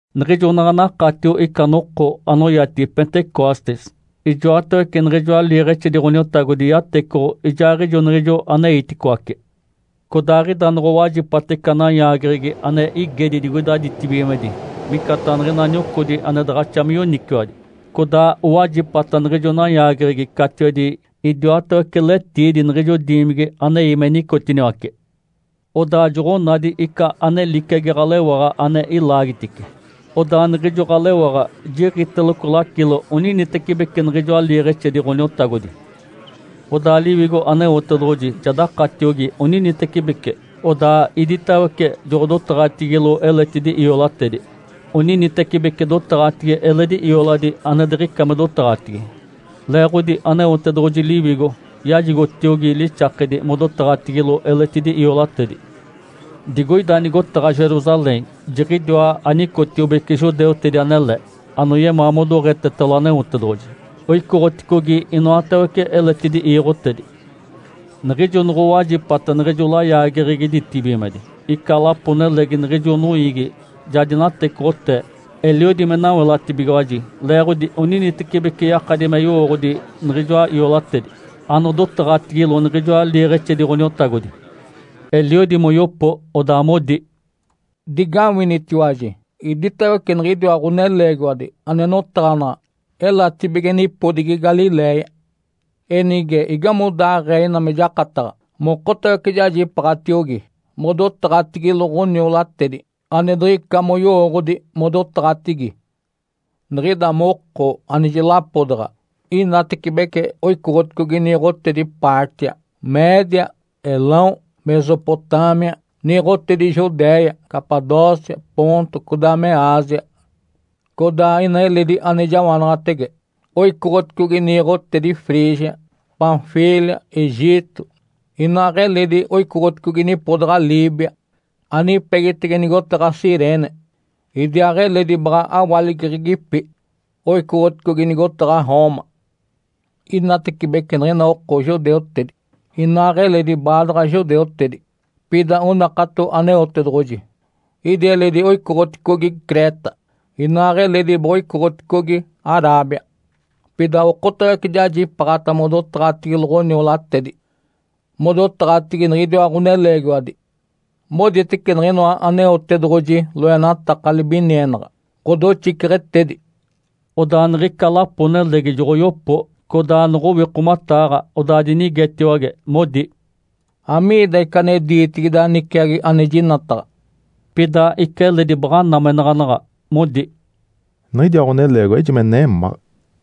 Niɡ̶ijo naɡ̶a nakatio ica noko anoyatigi “Pentecostes”, ijoatawece niɡ̶ijoa liiɡ̶exedi Ǥoniotagodi yatecoɡ̶o ijaaɡ̶ijo niɡ̶ijo aneiticoace. Codaaɡ̶ida noɡ̶owajipata ica nayaageɡ̶egi ane igedi digoida ditibigimedi micataɡ̶a niɡ̶ina niocodi ane daɡ̶axa me yoniciwadi. Codaa owajipata niɡ̶ijo nayaageɡ̶egi catiwedi idiwatawece letiidi niɡ̶ijo diimigi anei me nicotiniwace. Odaa joɡ̶onadi ica ane liciagi ɡ̶alewaɡ̶a ane ilaagitice, odaa niɡ̶ijo ɡ̶alewaɡ̶a jiɡ̶iteloco lacilo oninitecibeci niɡ̶ijoa liiɡ̶exedi Ǥoniotagodi. Odaa Liwigo Aneotedoɡ̶oji ja dakatiogi oninitecibeci, odaa iditawece joɡ̶odotaɡ̶atigilo eletidi iolatedi, oninitecibeci dotaɡ̶atigi eledi ioladi ane diɡ̶ica me dotaɡ̶atigi. Leeɡ̶odi Aneotedoɡ̶oji Liwigo yajigotiogi lixakedi modotaɡ̶atigilo eletidi iolatedi. Digoida nigotaɡ̶a Jerusalém jiɡ̶idiwa anicotiobece judeutedi anele, anoyemaa modoɡ̶etetalo Aneotedoɡ̶oji. Oicoɡ̶oticogi inoatawece eletidi iiɡ̶otedi. Niɡ̶ijo noɡ̶owajipata niɡ̶ijo layaageɡ̶egi ditibigimedi, ica lapo-nelegi niɡ̶ijo noiigi ja dinatecoɡ̶otee. Eliodi me nawelatibigiwaji leeɡ̶odi oninitecibeci yakadi me yowooɡ̶odi niɡ̶ijoa iolatedi anodotaɡ̶atigilo niɡ̶ijoa liiɡ̶exedi Ǥoniotagodi. Eliodi moyopo, odaa modi, “Digawinitiwaji! Idiwatawece niɡ̶idiwa ɡ̶oneleegiwadi ane notaɡ̶anaɡ̶a elatibige nipodigi Galiléia. Enige, igamodaaɡ̶ee ina me jakataɡ̶a mokotawece jajipaaɡ̶atiogi modotaɡ̶atigilo ɡ̶oniolatedi ane diɡ̶ica moyowooɡ̶odi modotaɡ̶atigi? Niɡ̶ida moko anejilapodaɡ̶a inatecibece oicoɡ̶oticogi niiɡ̶otedi Pártia, Média, Elão, Mesopotâmia, niiɡ̶otedi Judéia, Capadócia, Ponto, codaa me Ásia. Codaa ina eledi ane jawanaɡ̶atege oicoɡ̶oticogi niiɡ̶otedi Frígia, Panfília, Egito, inaaɡ̶eledi oicoɡ̶oticogi nipodaɡ̶a Líbia anipegitege nigotaɡ̶a Cirene. Idiaaɡ̶eledi baɡ̶a awaligeɡ̶egipi oicoɡ̶oticogi nigotaɡ̶a Roma. Inatecibece niɡ̶ina oko judeutedi, inaaɡ̶eledi baadaɡ̶a judeutedi, pida onakato Aneotedoɡ̶oji. Idi eledi oicoɡ̶oticogi Creta, inaaɡ̶eledi boɡ̶oicoɡ̶oticogi Arábia. Pida okotawece jajipaaɡ̶ata modotaɡ̶atigilo ɡ̶oniolatedi, modotaɡ̶atigi niɡ̶idiwa ɡ̶oneleegiwadi, moditece niɡ̶inoa Aneotedoɡ̶oji loenataka libinienaɡ̶a, ɡ̶odoxiceɡ̶etedi!” Odaa niɡ̶ica lapo-nelegi joɡ̶oyopo codaa noɡ̶owikomataaɡ̶a, odaa dinigetiwage, modi, “Amiida ica ane diitigi ida niciagi ane jinataɡ̶a?” Pida ica eledi baɡ̶a namenaɡ̶anaɡ̶a, modi, “Niɡ̶idiwa ɡ̶oneleegiwadi ejime nemáɡ̶a!”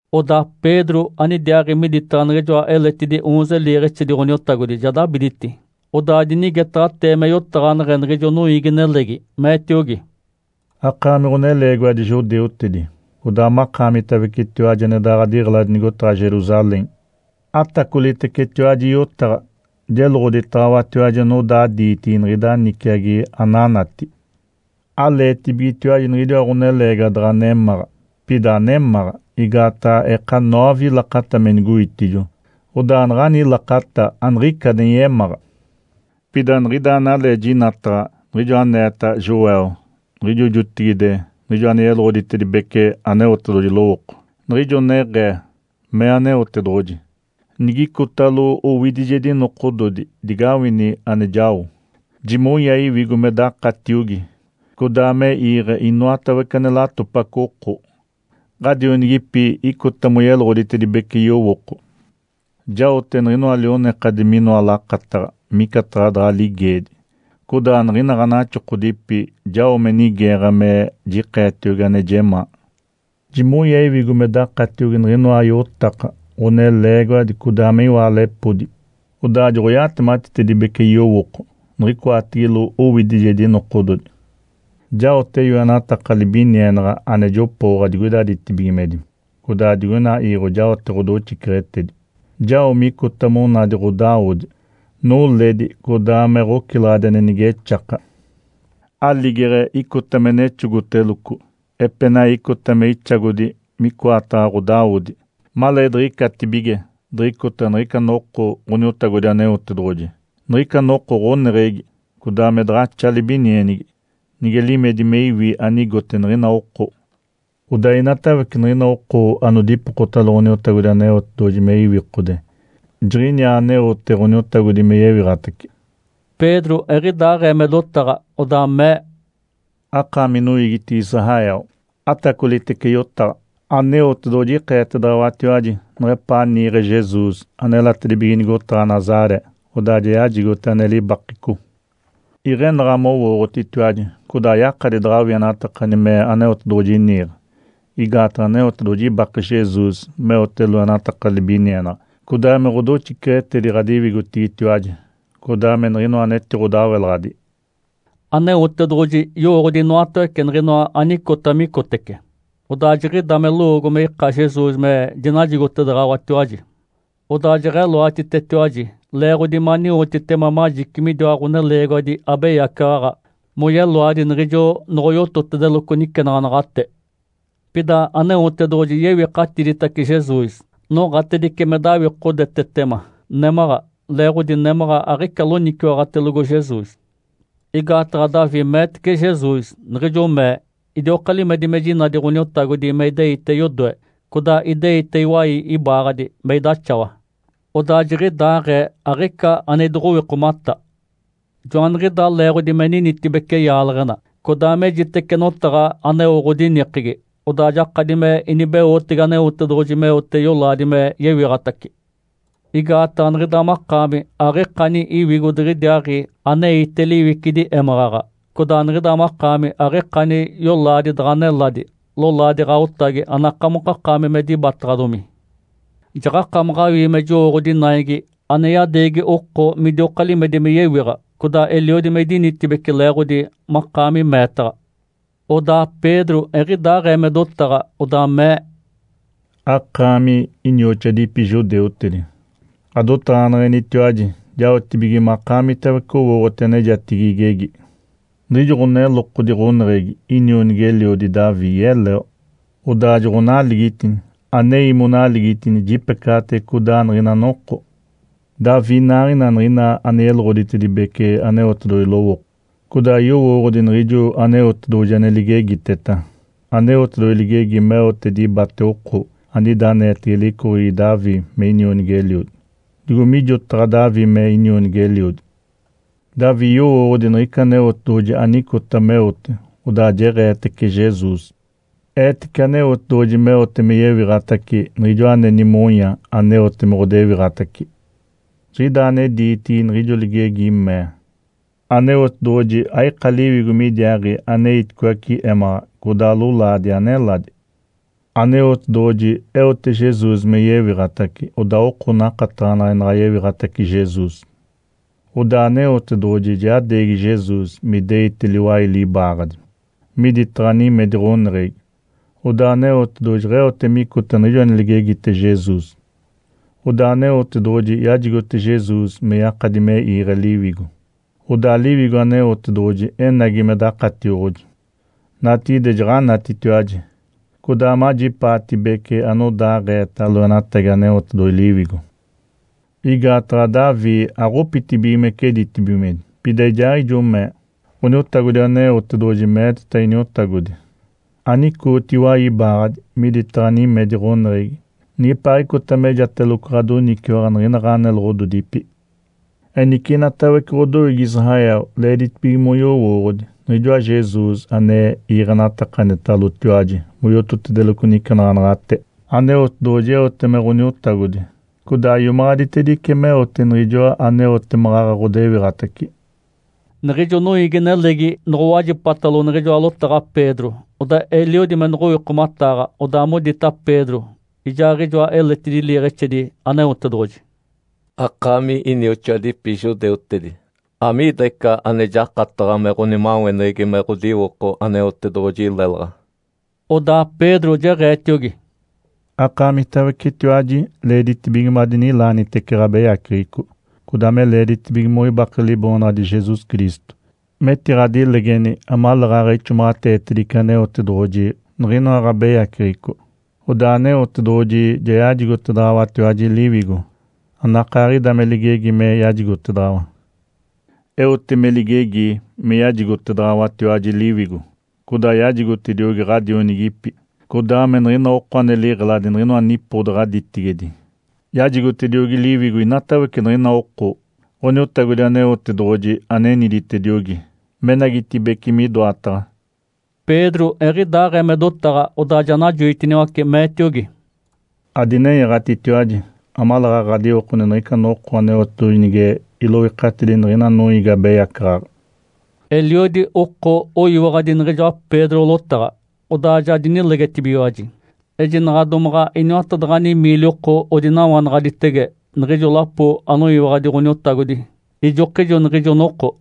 Odaa Pedro anidiaaɡ̶i miditaɡ̶a niɡ̶ijoa eletidi oonze liiɡ̶exedi Ǥoniotagodi ja dabiditi, odaa dinigetaɡ̶atee me yotaɡ̶aneɡ̶e niɡ̶ijo noiigi-nelegi. Meetiogi, “Akaami ɡ̶oneleegiwadi judeutedi, codaa makaamitawecetiwaji ane ɡ̶adiɡ̶eladi nigotaɡ̶a Jerusalém, atacolitecetiwaji yotaɡ̶a, jeloɡ̶oditaɡ̶awatiwaji anodaa diitigi niɡ̶ida niciagi ananati. Aleetibigetiwaji niɡ̶idiwa ɡ̶oneleegiwadi daɡ̶a nemáɡ̶a, pida anemáɡ̶a. Igaataɡ̶a eka noove lakata me nigoitijo. (Odaa naɡ̶ani lakata aniɡ̶ica ane yemáɡ̶a.) Pida niɡ̶ida analee jinataɡ̶a niɡ̶ijo aneeta Joel niɡ̶ijo jotigide, niɡ̶ijo ane yeloɡ̶oditedibece Aneotedoɡ̶oji lowooko, niɡ̶ijo neɡ̶ee, ‘Mee Aneotedoɡ̶oji, “Nigicotalo owidijedi nokododi digawini ane jao. Jimonya Iwigo me dakatiogi codaa me iiɡ̶e inoatawece ane latopaco oko. Ǥadionigipi icota moyeloɡ̶oditedibece yowooko. Jaote niɡ̶inoa lionekadi minoa lakataɡ̶a micataɡ̶a daɡ̶a ligeedi, codaa niɡ̶ina ɡ̶anaxokodipi jao me nigeeɡ̶a me jikeetiogi ane jemaa. Jimonya Iwigo me dakatiogi niɡ̶inoa iotaka, ɡ̶oneleegiwadi codaa me iwaalepodi. Odaa joɡ̶oyatematitedibece yowooko niɡ̶icoatigilo owidijedi nokododi. Jaote yoenataka libinienaɡ̶a ane jopooɡ̶a digoida ditibigimedi, codaa digoina iiɡ̶o jaote ɡ̶odoxiceɡ̶etedi. Jao micota monadi ɡ̶odawodi, noledi codaa me ɡ̶ocilaɡ̶adi ane nigexaka. Aligeɡ̶e icota me nexogoteloco, epenai icota me ixagodi micoataɡ̶a ɡ̶odawodi maleediɡ̶icatibige diɡ̶icota niɡ̶ica Noko Ǥoniotagodi Aneotedoɡ̶oji, niɡ̶ica Noko ɡ̶oneɡ̶egi codaa me daɡ̶axa libinienigi nige limedi me iwi anigote niɡ̶ina oko. Odaa inatawece niɡ̶ina oko ane dipokotalo Ǥoniotagodi Aneotedoɡ̶oji me iwikode, jiɡ̶iniaa aneote Ǥoniotagodi me yewiɡ̶atace.”’” Pedro eɡ̶idaaɡ̶ee me dotaɡ̶a, odaa mee, “Akaami noiigitigi Israel, atacolitece yotaɡ̶a! Aneotedoɡ̶oji ikeetedaɡ̶awatiwaji neɡ̶epaa niiɡ̶e Jesus anelatedibige nigotaɡ̶a Nazaré, odaa ja yajigote ane libakeco. Iɡ̶enaɡ̶a mowooɡ̶otitiwaji codaa ayakadi daɡ̶awienatakani me Aneotedoɡ̶oji niiɡ̶e, igaataɡ̶a Aneotedoɡ̶oji ibake Jesus meote loenataka libinienaɡ̶a codaa me ɡ̶odoxiceɡ̶etedi ɡ̶adiwigotigitiwaji, codaa me niɡ̶inoa anetiɡ̶odawelaɡ̶adi. Aneotedoɡ̶oji yowooɡ̶odi inoatawece niɡ̶inoa anicota micotece, odaa jiɡ̶ida me lowoogo me ika Jesus me dinajigotedaɡ̶awatiwaji. Odaa jeɡ̶eloatitetiwaji, leeɡ̶odi maniwotitema majici midiwa ɡ̶oneleegiwadi abeyacaɡ̶aɡ̶a moyeloadi niɡ̶ijo noɡ̶oyototedeloco nicenaɡ̶anaɡ̶ate. Pida Aneotedoɡ̶oji yewikatiditace Jesus. Noɡ̶atedice me dawikodetetema némaɡ̶a, leeɡ̶odi némaɡ̶a aɡ̶ica loniciwaɡ̶atelogo Jesus. Igaataɡ̶a Davi meetece Jesus, niɡ̶ijo mee, ‘Idioka limedi me jinadi Ǥoniotagodi me ideite yodoe. Codaa ideite iwai ibaaɡ̶adi me idaxawa, odaa jiɡ̶idaaɡ̶ee aɡ̶ica ane idoɡ̶owikomata. Joaniɡ̶idaa leeɡ̶odi me ninitibece yaaleɡ̶ena, codaa mejitece notaɡ̶a aneo ɡ̶odinikegi. Odaa jakadi me inibeotege Aneotedoɡ̶oji meote yolaadi me yewiɡ̶atace. Igaataɡ̶a niɡ̶ida makaami aɡ̶ikani iwigo diɡ̶idiaaɡ̶i aneite liwicidi émaɡ̶aɡ̶a. Codaa niɡ̶ida makaami aɡ̶ikani yolaadi daɡ̶a neladi, lolaadi ɡ̶aotagi anakamokakaami me dibataɡ̶adomi. Jaɡ̶akamaɡ̶a awii me jowooɡ̶odi naigi ane yadeegi oko midioka limedi me yewiɡ̶a, codaa eliodi me idinitibeci leeɡ̶odi makaami meetaɡ̶a.’” Odaa Pedro eɡ̶idaaɡ̶ee me dotaɡ̶a, odaa mee, “Akaami, inioxoadipi judeutedi, ɡ̶adotaɡ̶aneɡ̶enitiwaji jaotibige makaamitawece owooɡ̶oti anejatigi igegi. Niɡ̶ijo ɡ̶onelokodi ɡ̶oneɡ̶egi, inionigi-eliodi Davi yeleo, odaa joɡ̶onaligitini. Anei monaligitini jipecaɡ̶atege codaa niɡ̶ina noko. Davi inaaɡ̶ina niɡ̶ina ane yeloɡ̶oditedibece Aneotedoɡ̶oji lowooko, codaa yowooɡ̶odi niɡ̶ijo Aneotedoɡ̶oji ane ligegiteta. Aneotedoɡ̶oji ligegi meote dibate oko anida aneetege licoɡ̶egi Davi me inionigi-eliodi, digo mijotaɡ̶a Davi me inionigi-eliodi. Davi yowooɡ̶odi niɡ̶ica Aneotedoɡ̶oji anicota meote, odaa jeɡ̶eetece Jesus. Eetece Aneotedoɡ̶oji meote me yewiɡ̶atace Niɡ̶ijoa ane nimonya aneote me ɡ̶odewiɡ̶atace. Jiɡ̶idaa ane diitigi niɡ̶ijo ligegi mee, ‘Aneotedoɡ̶oji aika liwigo midiaaɡ̶i aneiticoace émaɡ̶aɡ̶a. Codaa lolaadi aneladi.’ Aneotedoɡ̶oji eote Jesus me yewiɡ̶atace, odaa oko nakataɡ̶anadi naɡ̶a yewiɡ̶atace Jesus. Odaa Aneotedoɡ̶oji ja yadeegi Jesus me ideite liwai libaaɡ̶adi, miditaɡ̶a nimedi ɡ̶oneɡ̶egi. Odaa Aneotedoɡ̶oji jeɡ̶eote micota niɡ̶ijo ane ligegite Jesus, odaa Aneotedoɡ̶oji yajigote Jesus me yakadi me iiɡ̶e Liwigo. Odaa Liwigo Aneotedoɡ̶oji enagi me dakatioɡ̶oji. Natigide jaɡ̶anatitiwaji, codaa majipaatibece anodaaɡ̶eeta loenatagi Aneotedoɡ̶oji Liwigo. Igaataɡ̶a Davi aɡ̶opitibigimece ditibigimedi, pida ijaaɡ̶ijo mee, ‘Ǥoniotagodi Aneotedoɡ̶oji meeteta Iniotagodi, “Anicooti iwai ibaaɡ̶adi miditaɡ̶a nimedi ɡ̶oneɡ̶egi nigepaaɡ̶icota mejateloco ɡ̶adoniciwaɡ̶a niɡ̶ina ɡ̶aneloɡ̶ododipi.” ’ Enice inatawece ɡ̶odoiigi Israel, leeditibige moyoowoɡ̶odi. Niɡ̶ijoa Jesus ane iiɡ̶enatakanitalotiwaji moyototedeloco nicenaɡ̶anaɡ̶ate, Aneotedoɡ̶oji eote me Ǥoniotagodi, codaa iomaɡ̶aditedice meote Niɡ̶ijoa aneote maɡ̶aɡ̶a ɡ̶odewiɡ̶atace.” Niɡ̶ijo noiigi-nelegi noɡ̶owajipatalo niɡ̶ijoa lotaɡ̶a Pedro, odaa eliodi me noɡ̶owikomataaɡ̶a, odaa modita Pedro ijaaɡ̶ijoa eletidi liiɡ̶exedi Aneotedoɡ̶oji, “Akaami inioxoadipi judeutedi, amiida ica ane jakataɡ̶a me ɡ̶onimaweneɡ̶egi me ɡ̶odiwoko Aneotedoɡ̶oji lelaɡ̶a?” Odaa Pedro jeɡ̶eetiogi, “Akaamitawecetiwaji leeditibige madinilaanitece ɡ̶abeyaceɡ̶eco, codaa me leeditibige moibake Liboonaɡ̶adi Jesus Cristo metiɡ̶adinilegeni amaleeɡ̶aɡ̶a ixomaɡ̶ateetedice Aneotedoɡ̶oji niɡ̶inoa ɡ̶abeyaceɡ̶eco. Odaa Aneotedoɡ̶oji ja yajigotedaɡ̶awatiwaji Liwigo, anakaaɡ̶ida me ligegi me yajigotedaɡ̶awa. Eote me ligegi me yajigotedaɡ̶awatiwaji Liwigo, codaa yajigotediogi ɡ̶adionigipi, codaa me niɡ̶ina oko ane liɡ̶eladi niɡ̶inoa nipodaɡ̶a ditigedi. Yajigotediogi Liwigo inatawece niɡ̶ina oko Ǥoniotagodi Aneotedoɡ̶oji aneniditediogi menagitibeci midoataɡ̶a.” Pedro eɡ̶idaaɡ̶ee me dotaɡ̶a, odaa ja najoitiniwace, meetiogi, “Adinenyaɡ̶atitiwaji amaleeɡ̶aɡ̶a ɡ̶adiwokoni niɡ̶ica noko Aneotedoɡ̶oji nige iloikatidi niɡ̶ina noiigi abeyacaɡ̶aɡ̶a!” Eliodi oko oyiwaɡ̶adi niɡ̶ijoa Pedro lotaɡ̶a, odaa ja dinilegetibigiwaji. Ejinaɡ̶a domaɡ̶a iniwatadaɡ̶ani miili oko odinawanaɡ̶aditege niɡ̶ijo lapo anoyiwaɡ̶adi Ǥoniotagodi ijokijo niɡ̶ijo noko.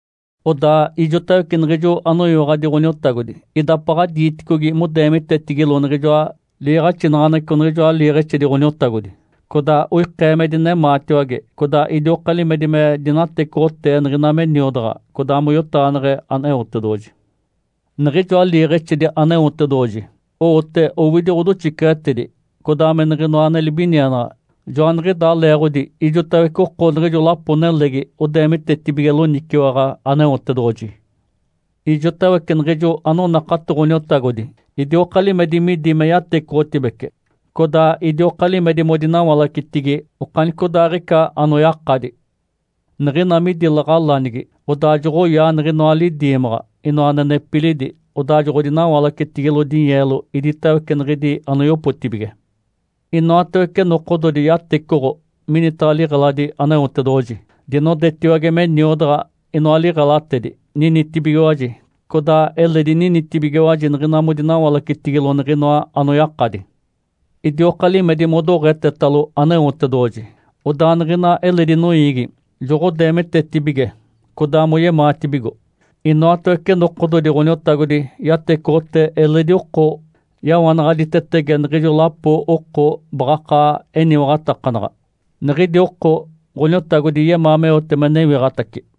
Odaa ijotawece niɡ̶ijo anoyiwaɡ̶adi Ǥoniotagodi idapaɡ̶a diiticogi modeemitetigilo niɡ̶ijoa liiɡ̶axinaɡ̶aneɡ̶eco niɡ̶ijoa liiɡ̶exedi Ǥoniotagodi, codaa oikee me dinemaatiwage, codaa idioka limedi me dinatecoɡ̶otee niɡ̶ina me niodaɡ̶a codaa moyotaɡ̶aneɡ̶e Aneotedoɡ̶oji. Niɡ̶ijoa liiɡ̶exedi Aneotedoɡ̶oji owote owidi ɡ̶odoxiceɡ̶etedi, codaa me niɡ̶inoa ane libinienaɡ̶a, joaniɡ̶idaa leeɡ̶odi ijotawece oko niɡ̶ijo lapo-nelegi odeemitetibige loniciwaɡ̶a Aneotedoɡ̶oji. Ijotawece niɡ̶ijo anonakato Ǥoniotagodi idioka limedi midi me yatecoɡ̶otibece, codaa idioka limedi modinawalacetigi okanicodaaɡ̶ica anoyakadi. Niɡ̶ina midi laɡ̶alanigi, odaa joɡ̶oyaa niɡ̶inoa lidiimaɡ̶a, inoa ane nepilidi, odaa joɡ̶odinawalacetigilo dinyeelo iditawece niɡ̶idi anoyopotibige. Inoatawece nokododi yatecoɡ̶o minitaɡ̶a liɡ̶eladi Aneotedoɡ̶oji. Dinodetiwage me niodaɡ̶a inoa liɡ̶elatedi, ninitibigiwaji, codaa eledi ninitibigiwaji niɡ̶ina modinawalacetigilo niɡ̶inoa anoyakadi. Idioka limedi modoɡ̶etetalo Aneotedoɡ̶oji, odaa niɡ̶ina eledi noiigi joɡ̶odeemitetibige codaa moyemaatibigo. Inoatawece nokododi Ǥoniotagodi yatecoɡ̶otee eledi oko yawanaɡ̶aditetege niɡ̶ijo lapo oko baɡ̶akaa eniwaɡ̶atakanaɡ̶a, niɡ̶idi oko Ǥoniotagodi yemaa meote me newiɡ̶atace.